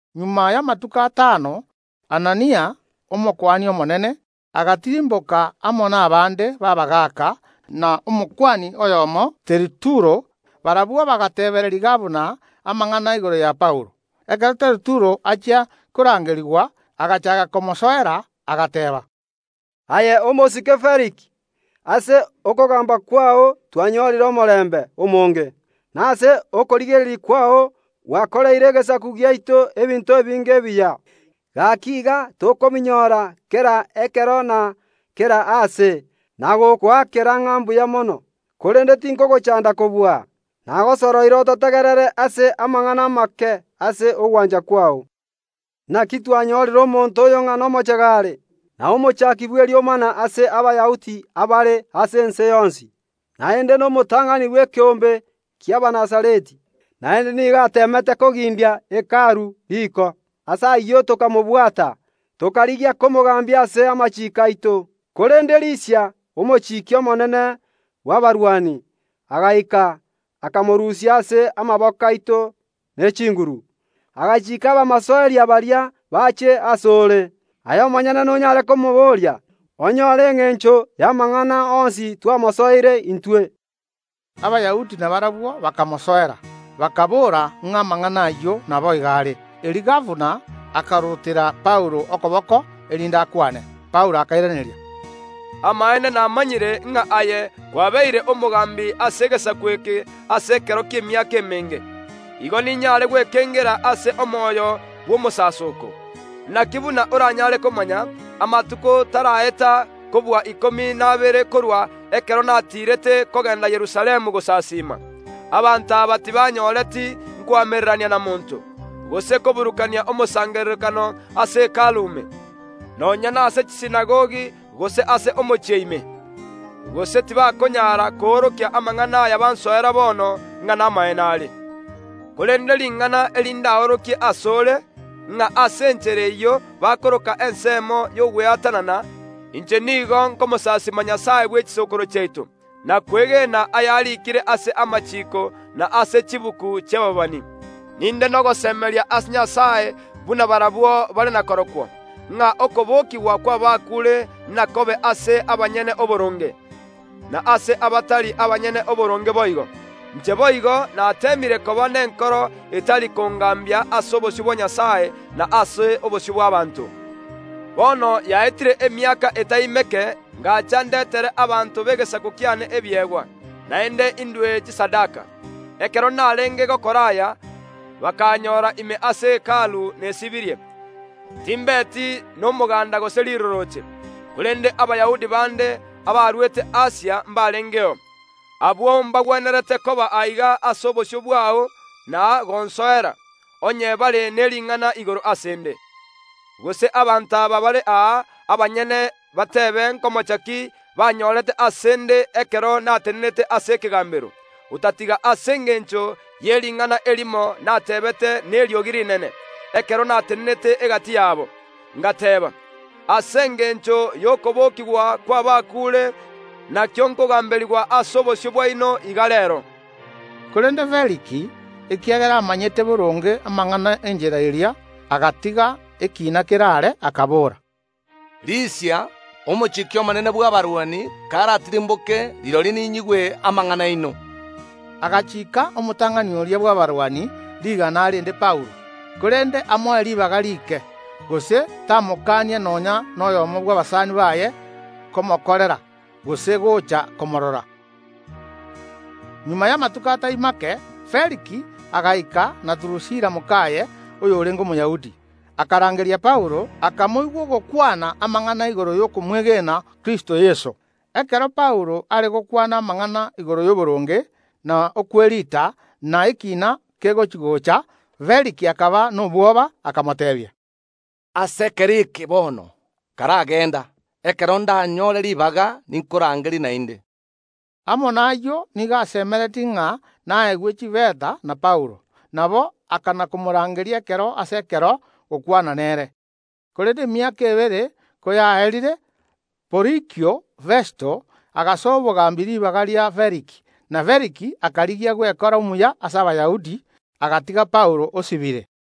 Magega y’amatuko atano, Anania, Omokuani omonene, agatirimboka amo nabande b’abagaaka na Omokuani oyomo, Teritulo; barabwo bagateebereria gabana amang’ana igoro ya Paulo. Ekero Teritulo achia korangerigwa, agachaaka komosoera, agateeba: “Aye, omosike Feliki, ase okogamba kwao twanyorire omorembe omonge, na ase okorigereria kwao gwakoreire egesaku giaito ebinto ebinge ebiya, gaki iga tokobinyora kera ekero na kera aase, na gokoakera ng’a mbuya mono. Korende tinkogochanda kobua, nagosoroire ototegerere ase amang’ana amake ase ogwancha kwao. Naki twanyorire omonto oyo ng’a nomochege are, na omochaaki bw’eriomana ase Abayahudi abare ase ense yonsi, naende nomotang’ani bw’ekeombe ki’Abanazareti. Naende nigo ateemete kogindia Hekalu riko. Ase ayio tokamobwata, [tokarigia komogambia ase amachiiko aito. Korende Lisia, omochiki omonene bw’abarwani, agaika, akamorusia ase amaboko aito ne chinguru, agachiika abamosoeri baria bache ase ore.] Aye omonyene nonyare komoboria, onyore engencho y’amang’ana onsi twamosoereire intwe.” Abayahudi nabarabwo bakamosoera, bakaboora ng’a amang’ana ayio naboigo are. Erio gabana akarutera Paulo okoboko erinde akwane. Paulo akairaneria, “Amaene namanyire ng’a aye kwabeire omogambi ase egesaku eke ase ekero ki’emiaka emenge, igo ninyare gwekengera ase omoyo bw’omosasoko. Naki buna oranyare komanya, amatuko taraeta kobua ikomi na abere korwa ekero natiirete kogenda Yerusalemu gosasiima. Abanto aba tibanyoreti nkoamererania na monto, gose koburukania omosangererekano ase Hekalu ime, nonya nase chisinagogi gose ase omochie ime. Gose tibakonyara koorokia amang’ana aya bansoera bono ng’a namaene are. Korende ring’ana eri ndaorokie ase ore, ng’a ase enchera eyio bakoroka ensemo y’ogweatanana, inche nigo nkomosaisima Nyasae bwe chisokoro chiaito, na kwegena ayariikire ase amachiiko na ase chibuku chi’ababani. Ninde nogosemeria ase Nyasae buna barabwo bare nakorokwo, ng’a okobokigwa kw’abakuure nakobe ase abanyene oboronge, na ase abatari abanyene oboronge boigo. Inche boigo nateemire koba nenkoro etari kongambia ase obosio bwa Nyasae, na ase obosio bw’abaanto. Bono yaetire emiaka etai meke ngacha ndetere abanto b’egesaku kiane ebiegwa, naende indue chisadaka. Ekero narenge gokora aya, bakaanyora ime ase Hekalu nesibirie, timbeti nomoganda gose rirorooche. Korende Abayahudi bande, abarwete Asia mbarengeo. Abwo mbagwenerete koba aiga ase obosio bwao na gonsoera, onye bare ne ring’ana igoro ase ’nde. Gose abanto aba bare aa abanyene bateebe nkomocha ki banyorete ase ’nde ekero natenena ase ekegambero, otatiga ase engencho ye ring’ana erimo nateebete neriogi rinene, ekero natenenete egati yabo. Ngateba: Ase engencho y’okobokigwa kw’abakuure nakio nkogamberigwa ase obosio bwaino iga reero.” Korende Feliki, ekiagera amanyete boronge amang’ana ’Enchera eria, agatiga ekiina keraare, akabora: “Lisia, omochiki omonene bw’abarwani karatirimboke, rirorio ninyigwe amang’ana aino.” Agachiika omotang’ani oria bw’abarwani rigana arende Paulo, korende amoe ribaga rike, gose tamokania nonya noyomo bw’abasani baye komokorera, gose gocha komorora. Magega y’amatuko atari make, Feliki agaika na Durusila mokaye, oyorenge Omoyahudi. Akarangeria Paulo, akamoigwa ogokwana amang’ana igoro y’okomwegena Kristo Yeso. Ekero Paulo are gokwana amang’ana igoro y’oboronge, na okweriita, na ekiina kegochi‐gocha, Feliki akaba nobwoba, akamoteebia: “Ase ekero eke bono, karagenda; ekero ndanyore ribaga, ninkorangerie naende.” Amo nayio nigo asemeretie ng’a naegwe chifeta na Paulo. Nabo akana‐komorangeria ekero ase ekero gokwana nere. Korende emiaka ebere koyaerire, Porikio Festo agasoa obogambi ribaga ria Feliki; na Feliki akarigia gwekora omuya ase Abayahudi, agatiga Paulo osibire.